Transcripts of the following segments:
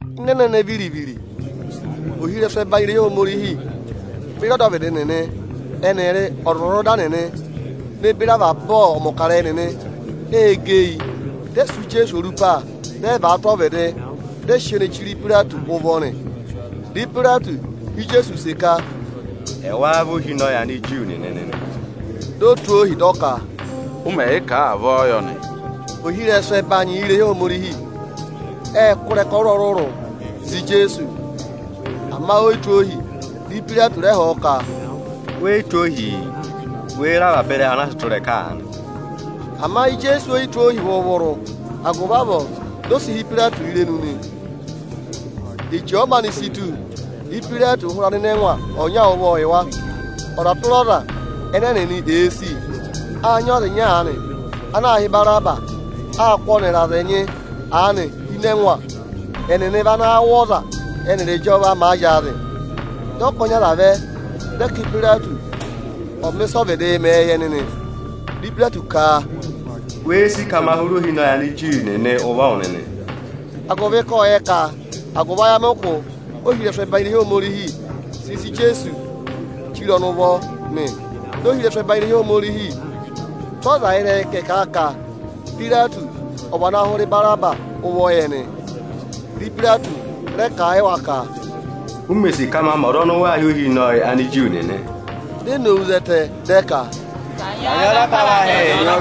Ịnị ẹnẹnẹ viri-viri, ohirẹsụ ẹbanyị irehi Ohomorihi beri ọdọvịdị nịnị ẹnịrị ọzwọzọda nịnị ne beri avaba ọmọkarẹyị nịnị ê gẹ eyi, dị ẹ sụ́ Ijeesu orupa, dị ẹ vàa tụ́ ọvịdị, dị ẹ sị ọọ ne chire Ipayireti ụvọ nị. Dị Ipayireti họ̀ Ijeesu use ka, “Ẹ wáá vị ohinọyị Aniju nịnị nị?” Di o tụ́ ohi, dị ọ ka, “Ụ mẹ̀ yị kà a, avọọ yọ nị.” Ohirẹsụ ẹbanyị irehi Ohomorihi ệ kụ́ ịrẹka ọrụrụ-ọrụrụ za Ijeesu; ama o yi tụ́ ohi. Dị Ipayireti rẹ họ̀ ọ ka, “We yi tụ́ ohii? Wê re avaba ịrẹyị awụ ana a sị tụ́ ịrẹka aanị.” Ama Ijeesu oyi tụ́ ohi vụrụ-vụrụ; agụvị avọọ di o si hí Ipayireti irenu nị. Eche ọ̀ọ maanị si tù, Ipayireti ụụ̄ hụrẹ anịnẹngwa ọnya ụvọ yị wa, ọza tụra ọza ẹnẹ ẹnịnị èe sì. Â nyị ọza ịnya aanị ana aā hị́ Ibaraba. Â kụ́ ọnịrị aza ẹnyị aanị hi ịnị ẹngwa. Ẹnịnị vị ana wụ̀ ọza, ẹ́nịrị ịjọva màa zyaazị. Dị ọkọnị aza vẹ, dị ẹ ka Ipayireti ọ̀ mẹ ịsị ọọ̄ vịdịị mẹ yị ẹnị nị. Dị Ipayireti ka, “Wéé sì ka ma hụrẹ Ohinọyị Aniju nịnị ụvọ wụ nịnị?” Ộ yẹ ka agụvị ayamịkụ ohirẹsụ ẹbanyị irehi Ohomorihi sị sị Ijeesu chire ọnị ụvọ nị. Dị ohirẹsụ ẹbanyị irehi Ohomorihi tụ́ aza ịrẹyị ka ẹ̀ kà a ka Ipayireti ọ̀ vana hụrẹ Ibaraba ụvọ yị ẹnị. Dị Ipayireti rẹ kà a yị wa ka, “U mè sì ka ma mẹ ọza ọnị ụ wa hị́ Ohinọyị Aniju nịnị aanị?” Di e nowu zẹtẹ, dị ẹ ka, “Kanyị ọọ za apavahị!”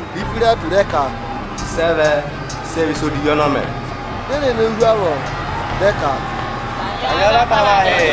Dị Ipayireti rẹ ka, “Sị ẹ vẹ? Sị ẹ vị ịsa odivi ọnị ọ mẹ̀?” Di e re nowu hu avọọ, dị ẹ ka, “Kanyị ọọ za apavahị!”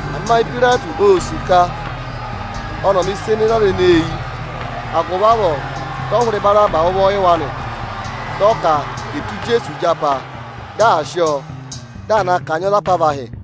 Ama Ipayireti ô sì ka ọnị ọ̀ mẹ̀ ịsa ene zè aza ẹnẹẹ eyi; agụvị avọọ dị ọ hụrẹ Ibaraba ụvọ yị wa nị; Dị ọ ka è tụ́ Ijeesu ịjapa, dị à sị ọọ, dị à na kanyị ọọ za apavahị.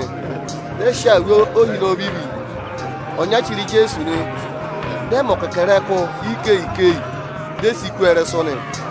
Ẹnịnị ệ sị awuru ohinọyị ovivi ọnya chire Ijeesu. Dị ẹ mẹ ọkẹkẹrẹkụ ikeyi-ikeyi, di e si kú ọọ ịrẹsụ nị.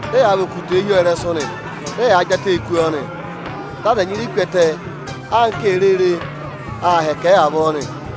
Dị ẹyaa và okutẹẹ hi ọ ịrẹsụ nị. Dị ẹyaa jị atẹẹ kú ọọ nị, dị aza ẹnyị ree ku ẹtẹ (anka èe rere) aa hẹkẹ ẹ avọọ nị.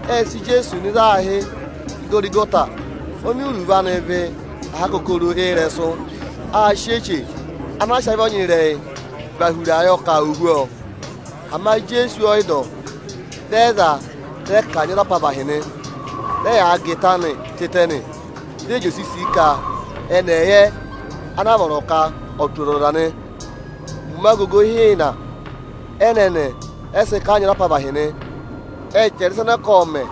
Ệ sị Ijeesu nọ ịzị aā hị́ Ịgọrịgọta (oni iruvo anị vị “aha akokoro ịrẹsụ”). Â sị eche ana a sị avị ọnyịrẹyị và hura yọ ka ò hú ọọ. Ama Ijeesu ọ yị dọ ọ. Dị ẹ za a, dị ẹ kanyị ọọ za apavahị nị. Dị ẹyaa gà ịta anịị hi ẹngụ ụvọ, dị ẹ jị osisii ka ẹnị ẹ̀ yẹ ana vọrọ ka ò tụ́ ọzọza nị. Ụmẹ agogo ịhịịna ẹnẹnẹ ẹ sị kanyị ọọ za apavahị nị. Ệ chẹrẹ ịsa ẹnẹ ẹ ka ộ mẹ̀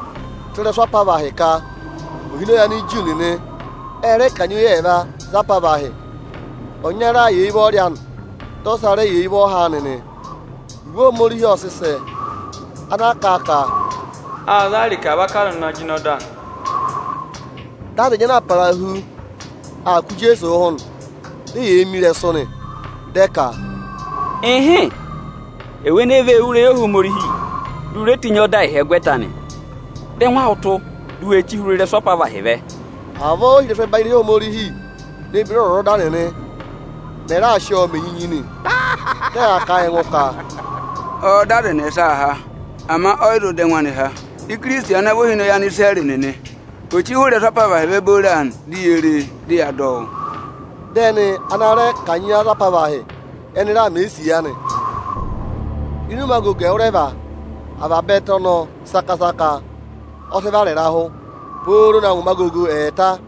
tụ́ ịrẹsụ apavahị ka, “Ohinọyị Aniju nịnị.” Ệ rẹ kanyị oyi ẹẹva za apavahị; ọnyara yà eyi ụvọrị anị, dị ọsa rẹ yà eyi ụvọha anị nị. [Iwe Ohomorihi ọ sị sẹ, ana kà a ka: “Â za a ịrịka vaka aza ana jịnẹ ọda.”] Dị aza ẹnyị ana aa parahu aa kụ̀ Ijeesu ụhụ nị; di eyee mi ịrẹsụ, dị ẹ ka, “Ịhịịn, ewu ene vee wú irehi Ohomorihi, di u re tenyi ọọ dà ịhyẹgwẹta anị. Dọ ẹngụ awụ tụ́, di u we chí hụrẹ ịrẹsụ apavahị vẹ!” Avọọ ohirẹsụ ẹbanyị irehi Ohomorihi ne beri ọzwọzọda nịnị mẹ̀ raa sị ọọ mẹ enyinyi nị. Dị ẹ yaa kà a yị ẹngụ ka, “Ọọ̄ dọ aza ẹnẹsa há, ama ọ yị zụ dọ ẹngụ anị há. Ikirisiti ana vị Ohinọyị Anisirẹrị nịnị ò chí hụrẹ ịrẹsụ apavahị vẹ booro aanị, di yee re e, dị yaa dọ ọ wụ́!” Dị ẹnị ana a rẹ kanyị za apavahị, ẹnị raa mẹ̀ ẹ isiya nị. Ịnị ụmẹ agogo ẹwụrẹva, avaba ẹtẹ ọnọọ saka-saka ọ sị vara ịrahụ, pooro na ngụ ụmẹ agogo ẹẹta.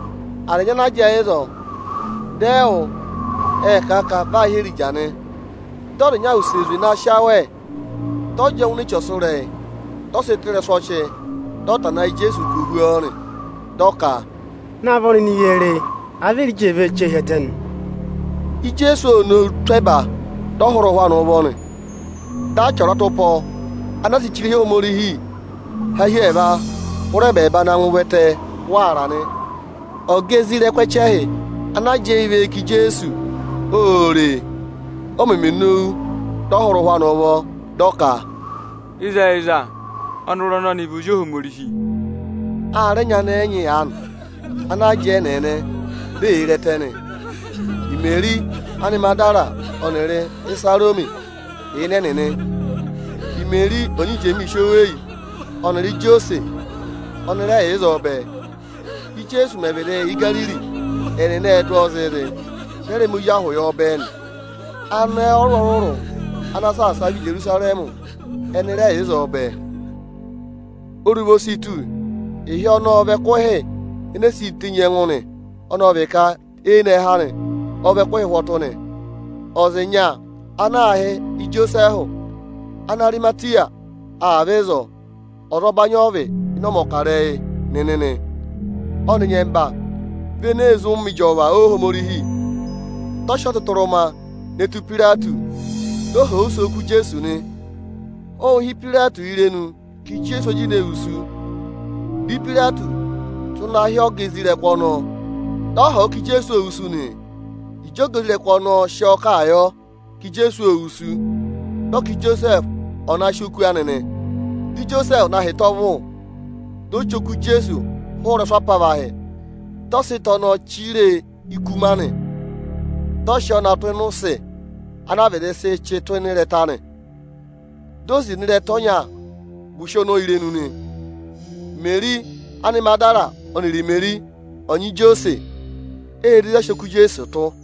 Aza ẹnyị ana jẹẹ ịzọọ, dị ẹ wụ́, ệ kà a ka vị aa hị́ Erija nị. Dị ọza ịnya wuse zwe na sị awẹ, dị ọ jị ọọ ngụ ini eche ọsụrẹyị, dị ọ sị tụ́ ịrẹsụ ọchị, dị ọ tana ẹ yị Ijeesu ka ò hú ọọ nị. Dị ọ ka, “Naavọ nịnị ye re e, àa vị Erija ee vee chí ọọ hi ẹtẹ nị!” Ijeesu ộ nowu tụ́ ẹba, dị ọ hụrẹ ụhwẹ anị ụvọ nị. Dị achị ọratụpọ anaa sị che irehi Ohomorihi, há hi ẹẹva hụrẹ ẹbẹẹba na ngụ ụvẹtẹ waara nị. Ọga ana sị eyi pe isoja ẹchẹhị nịnị ana jẹẹ và eyi ká Ijeesu ô re e, o meme nowu, dị ọ hụrẹ ụhwẹ ụvọ; dị ọ ka, “Ịzẹyịza, ọnọrụ ọnọnị vị Ozi Ohomorihi!” A rẹ nyị anẹẹ ẹnyị aanị ana jẹẹ ẹ́nẹẹnẹ, di eyee re ẹtẹ nị. Imeri Anịmagịdara ọnịrị Ịsarọmị yà ịnị ẹnịnị; Imeri ọnyị Ijemiisi oweyi ọnịrị Ijosẹsị ọnị rẹ yà ịzọọ bẹẹ. Ijeesu mẹ̀ vịdị yà Igariri, ẹnịnị ệ dụ ọọ zịịzị, dị ẹ rẹ sị ịsa mẹ ọgụvọ yọ bẹẹ nị. Anẹẹ ọrụrụ-ọrụrụ ana saasa a vẹ Ijerusarẹmị ẹnị rẹ yà ịzọọ bẹẹ. Oruva o si tù; ịhị ọnọọ ọ vị ẹkụhị enee siī tenyi ẹngụ nị, ọnọọ vị ka eyinẹhẹ anị ọ vị ẹkụhị ụhwọtụ nị. Ọza ịnya ana aā hị́ Ijosẹẹhụ Anarịmatịya ộ vẹ ịzọọ. Ọzọbanyị ọ vị ịnị ọmọkarẹyị nịnị nị; ọnị nyẹmba vị ene ee zí ụmẹ ịjọva Ohomorihi. Dị ọ sị ọtụtụrụma ne tù Ipayireti, di o họ̀ use oku Ijeesu nị. Ô hí Ipayireti irenu ka Ijeesu ọ jịnẹ wusu. Dị Ipayireti tụ́ na hị́ ọga isoja nịnị ọnọọ, dị họ̀ ọ ka Ijeesu óó wusu nị. Ịjị ọga isoja nịnị ọnọọ sị ọọ kà a yọ ka Ijeesu ô wusu, dị ọ ka Ijosẹẹhụ ò na sị oku anị nị. Dị Ijosẹẹhụ na hị́ ịta ọvụ, di o chí oku Ijeesu hụrẹ ịrẹsụ apavahị, dị ọ sị ịta ọnọọ chire e ikuma nị. Dị ọ sị ọọ na tụ́ ịnị ụsị ana a vịdị sị chị tụ́ ịnị ịrẹta nị. Di o zina ịrẹta ọnya gù ụsị ọnọọ irenu nị. Imeri Anịmagịdara ọnịrị Imeri ọnyị Ijosẹsị ê re ịzị a sị oku Ijeesu tụ́.